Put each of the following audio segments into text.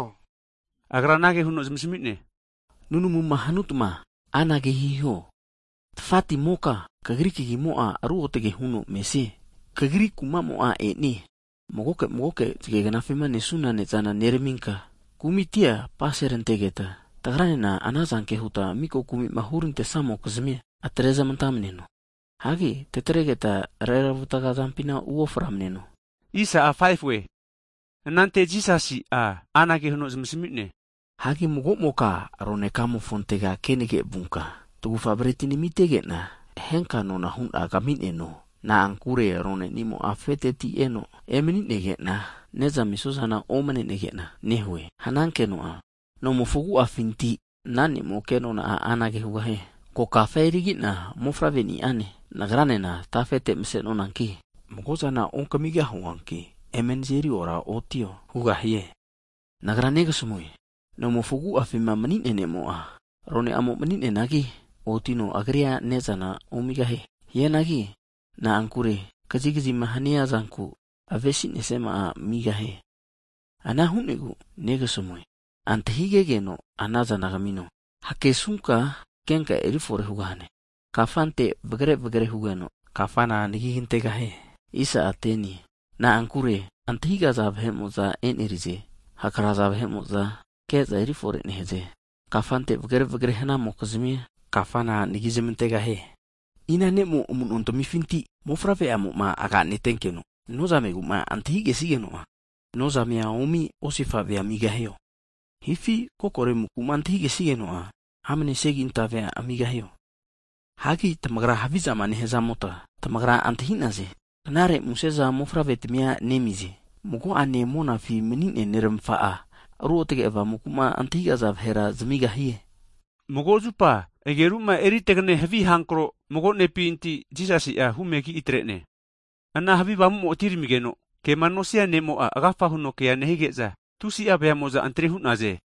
Higeno Agra anage huno zamasami'ne, Nunamuma hanutma anage hiho, Tafatimoka Kagri Kagimo'a ruotge huno mesie. Kagri kumamo'a e'nie. Magoke magoke zage knafima nesuna ne'zana (bretia) neraminka, kumitia apaserantegeta, tagranena anazanke huta miko kumima hurantesamokizmia atrezmantamneno. Hagi tatregeta reravataga zampina u'oframneno. Huteno anante Jisasi'a anage huno zamasami'ne, Hagi magomoka roneka'amofontega kenage vunka, tagufa breti namitegena, henka nonahuna kamineno, na'ankure ronenimo'a afeteti eno emaninegena, ne'zama amisuazana omanenegena nehue hanankeno'a, nomofo agu'afinti ana ne'mo'a kenona anage hugahie. Ko kafa erigi'na mofavre'ni'ane, nagranena tafete mase'nonanki, mago'zana eri onkamigahuanki eme nazeri oraotio hugahie. Nagra neramasamue, nomofo agu'afima mani'nea ne'mo'a, arone'amo mani'neanagi otino agrira ne'zana omigahie. Hianagi na'ankure kazikazima hania zanku avesinesiama'a eri amigahie. Ana hu'negu Nagra neramasamue, antahigegeno, anazana kamino, hakesunka, kenka eri fore hugahane. Kafante vagre vagre hugeno, kafamo'a anagi kantegahie. Na'ankure antahigaza vahe'mo'za e'nerize. Hakraza vahe'mo'za, keza eri fore nehaze, kafante vagre vagre hanamokizmia, kafana anagi zmantegahie. Ina ne'mo amuno tamifintira, mofavre'amo'ma aganetenkeno nozamegu'ma antahigesigeno'a, nozamea omi osifavea eri amigahio? Hifi kokore amuku'ma antahigesigeno'a, amane segintave (Scorpion) amigahio? Hanki tamagra havizama nehzamota, tamagra antahinaze. Knare museza mofavretmia nezamize. Mago'ane monafi mani'nea Neramafa'a, Ruotge Avamuku'ma antahigaza vahera zamigahie! Mago zupa ageruma eri tagane havi avamu mago ne'pinti Jisasi'a humegi atrene. Ana havi avamumo atineramigeno, kema nosia nemo'a agafa huno kea nehige'za, tusi'a veamo'za antri hu'naze.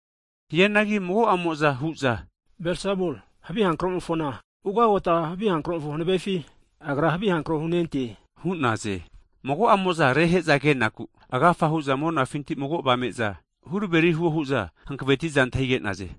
Hianagi mago'amo'za hu'za, havi hankromofo ugagota kvazmimofo Belsebuli hanavefi, Agra havi avamura hunente hu'naze. Mago'amo'za rehe'za kenaku, agafa hu'za monafinti mago avame'za huraveri huo hu'za hankavetiza antahige'naze.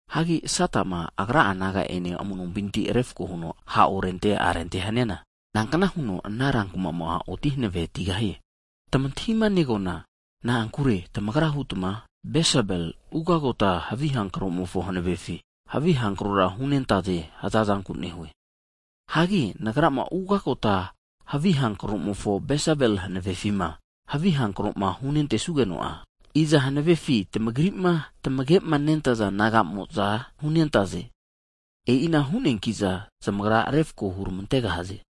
Hagi Satama agra'a naga'ane amu'nompinti refko huno ha' orente arente haniana, nankna huno ana kuma'amo'a oti hankavetigahie? Tamantahimanegoana, na'ankure tamagra hutma, Belsebul ugagota havi hankromofo hanavefi, havi hankrora hunente hazazanku nehue. Hagi Nagra'ma ugagota havi hankromofo Belsebul hanavefima, havi hankroma huntesugeno'a, iza hanavefi tamagri'ma tamagema nentaza naga'mo'za hunentaze? E'ina hu'neankiza zamagra refko hurmantegahaze.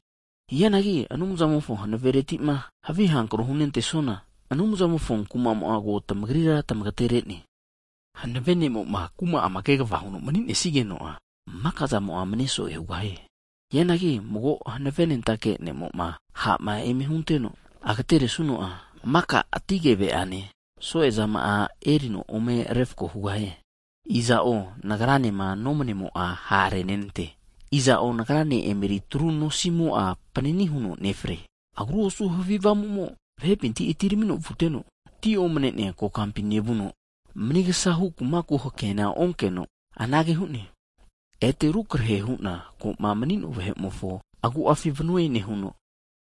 Hianagi Anumzamofo hanaveretima havi avamu hunentesuana, Anumzamofo kumamo'a ko tamagrite e'ne. Hanave ne'moma kuma'ama kegava huno manisigeno'a, maka zama'amo'a mane so'e hugahie. Hianagi mago hanavenentake ne'mo'ma ha' eme hunteno agateresuno'a, maka ati keve'ane, so'e zama'a erino ome refko hugahie. Iza'o Nagranema nomanimo'a ha' renenante. Iza'o Nagrane emeritru nosimo'a repanini higeno nefre. Agru osu havi avamumo vahepinti atiramino vuteno, ti omane'nea kokampi nevuno, manigasahu kumaku hakeana onkeno anage hu'ne. Ete rukrahe hu'na ko'ma mani'no'a vahe'mofo agu'afi vanue nehuno,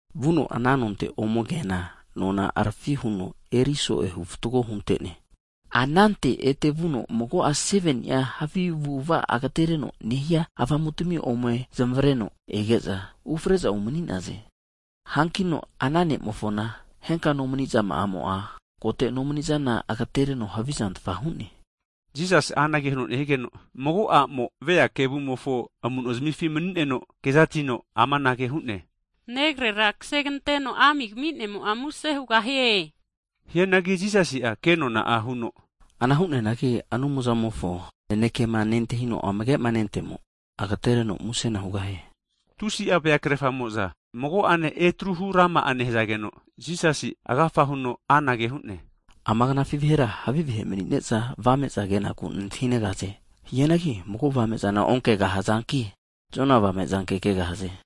vuno ana nonte ome keana, nona harafi huno eri so'ehu fatgo hunte'ne. Anante ete vuno mago'a 7ni'a havi avu'ava agetereno nehia avamutmi ome zmavareno ege'za, ufre'za umani'naze. Hankino ana ne'mofona henka nomani'zamo'a, kote nomanizana agatereno havizantfa hu'ne. Jisasi'a anage huno nehigeno, mago a'mo vea kevumofo amuno'zimifi mani'neno kezatino, amanage hu'ne, Negrera kaseganteno ami kami'nemo'a muse hugahie. Hianagi Jisasi'a kenona huno, Ana hu'neanagi Anumzamofo nanekema nentahino amagema nentemo, agatereno musena hugahie. Tusi'a vea krefamo'za mago'ane etruhu rama nehazageno, Jisasi'a agafa huno anage hu'ne, Ama knafi vahera havi vahe mani'ne'za avame'za kenaku nantahinegaze. Hianagi mago avame'za onkegahazanki, Jona avame zanke kegahaze.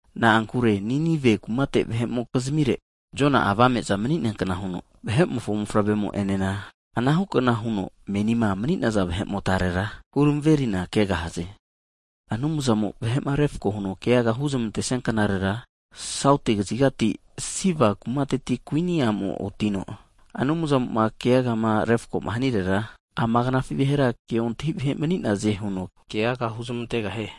Na'ankure Ninive kumate vahe'mokizmire, Jona'a avame'za mani'neankna huno, Vahe'mofo Mofavremo enena anahukna huno menima mani'naza vahe'motarera huramaverina kegahaze. Anumzamo'ma vahe'ma refko huno keagama huzmantesia knarera, Sauti kaziga Siba kumateti Kuini a'mo'a otino, Anumzamo'ma keagama refkoma hanirera, ama knafi vahera keontahi vahe mani'naze huno keaga huzmantegahie.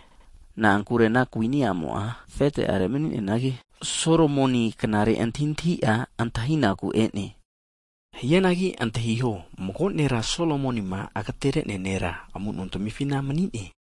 Na'ankure ana kuini amo'a afete'arega mani'neanagi, Solomoni knare antahintahi'a antahinaku e'ne. Hianagi antahiho, mago nera Solomonima agaterenea nera amuno tamifina mani'ne.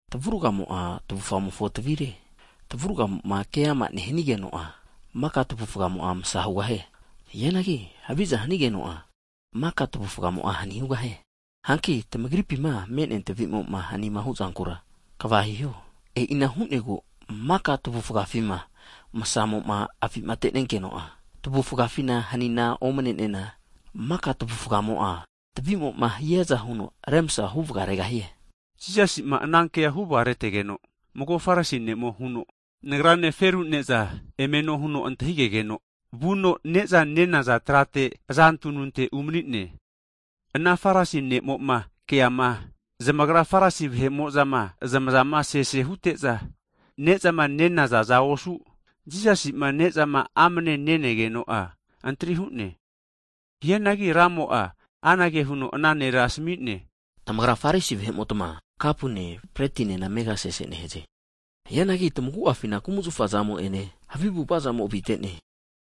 Tamavurgamo'a tamavufgamofo tavire, tamavurgamo'ma keama nehanigeno'a, maka tamavufgamo'a masa hugahie. Hianagi haviza hanigeno'a maka tamavufgamo'a hani hugahie. Hanki tamagripima me'nea tavi'moma hanima huzankura, kva hiho. E'ina hu'negu maka tamavufgafima msamoma avimatenenkeno'a, tamavufgafina hanina omnenena, maka tamavufgamo'a tavimoma hiaza huno remsa hu vagaregahie. Jisasi'a ana kea huvagaretegeno, mago Farisi ne'mo'a huno, nagrane feru ne'zana eme no huno antahigegeno, vuno neza nenaza trate aza tununte (reclined) umanine. Ana Farisi ne'mo'ma keama, zamagra Farisi vahe'mo'zama zamazama sesema hute'za nezama nenazaza osu, Jisasima nezama amne nenegeno'a, antri hu'ne. Hianagi Ramo'a anage huno ana nera asami'ne, Tamagra Farisi vahe'motma kapune, pletinena amega sese nehaze. Hianagi tamagu'afina kumazafa zamo'ene, havi avu'avazamo avite'ne.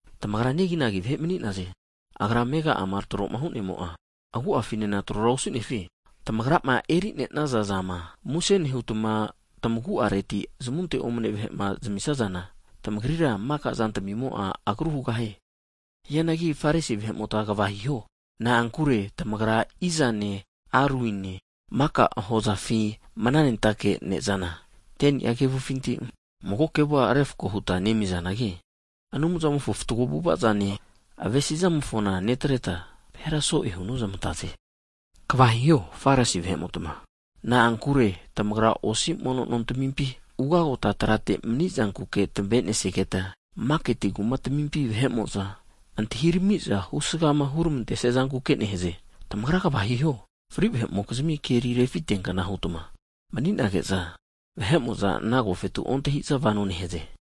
Tamagra negi vahe mani'naze, Agra amegama troma hu'nemo'a, agu'afinena trora osunefi? Tamagrama erinenaza zama, muse nehutma tamagu'areti huta zamunte omane vahe'ma zamamisazana, tamagrira maka zantamimo'a agru hugahie. Hianagi Farisi vahe'mota kva hiho! Na'ankure tamagra izane aruine, maka hozafinti mananentake ne'zana 10ni'a kevufinti, mago kevua refko huta nemizanagi, Anumzamofo fatgo avu'avazane, avesizamofona netreta, vahera so'e hunozmantaze. Kva hiho Farisi vahe'motma! Na'ankure tamagra osi mono nontamimpi ugota trate mani'zanku tamavenesigetma, maketi kumatamimpi vahe'mo'za antahiramiza husgama huramantezankuke nehaze. Tamagra Kva hiho! Fri vahe'mokizmi keri refiteankna huta mani'nage'za, vahe'mo'za ana agofetu ontahiza vano nehaze.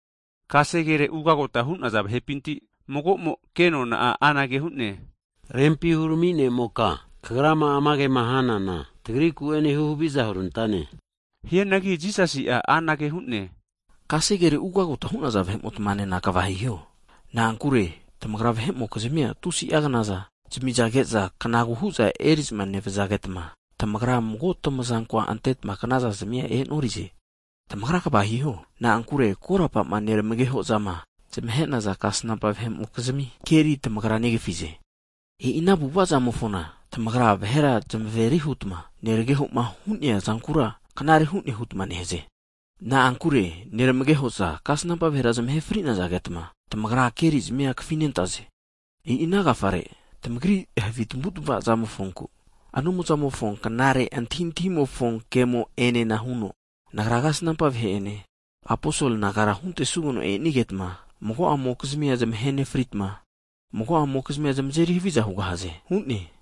Kasegere ugagota hu'naza vahepinti mago'mo kenona anage hu'ne, Rempi hurami ne'moka, kagrama ama kema hanana, tagriku'ene huhaviza hurantane huno hu'ne. Hianagi Jisasi'a amanage hu'ne, Kasegere ugagota hu'naza vahe'motmanena kva hiho. Na'ankure tamagra vahe'mokizmia tusi'a knaza zamizage'za kanagu hu'za eri'za nevazagetma, tamagra mago tamazankoa antetma knaza zmia e'norize. Tamagra kva hiho! Na'ankure korapama neramagehozama zamahe'naza kasnampa vahe'mokizmia keri tamagra negafize. E'i ana avu'avazamofona, tamagra vahera zmaveri hutma, neramagehoma hu'neazankura knare hu'ne hutma nehaze. Na'ankure neramageho'za kasnampa vahera zamahe fri'nazagetma, tamagra kerizmia kafinentaze. E'i ana agafare, tamagri havi tamavu tamavazamofonku, Anumzamofo knare antahintahimofo kemo'enena huno, Nagra kasnampa vahe'ene, aposol nagara huzmantesugeno e'nagetma, mago'amokizmia zamahe nefritma, mago'amokizmia zamazeri haviza hugahaze hu'ne.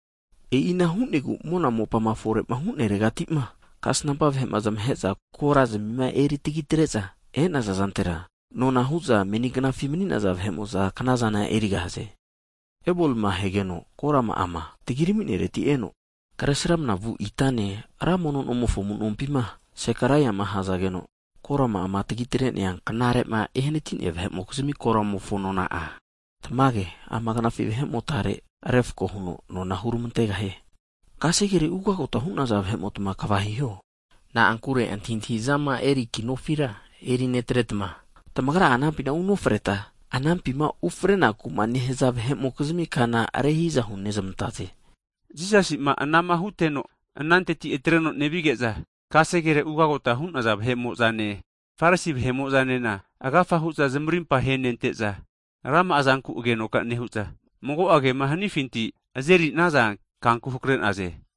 E'ina hu'negu, mona mopama fore'ma hu'neregatima kasnampa vahe'ma zamahe'za korazmima eritagi atre'za e'naza zantera, nona hu'za meni gnafima mani'naza vahe'mo'za knazana erigahaze. Abelima ahegeno korama'ama tagiraminereti eno, Kresramana vu itane ra mono nomofo amu'nompima Zekaraiama ahazageno, korama'ama tagitre'nea knarema ehanati'nea vahe'mokizmi koramofo nona'a, tamage ama knafi vahe'motare refko huno nona huramantegahie. Kasegere ugagota hu'naza vahe'motma kva hiho! Na'ankure antahi'zama eri ki nofira erinetretma, tamagra'a anampina unofreta, anampima ufrenaku'ma nehaza vahe'mokizmi kana rehi'za hunezmantaze. Jisasi'ma anama huteno'a, ananteti atreno nevige'za, kasegere ugagota hunaza vahe'mo'zane, Farisi vahe'mo'zanena agafa hu'za zamarimpa henente'za, rama'a zanku agenoka nehu'za, mago'a kema hanifinti azerinaza kanku hake'naze.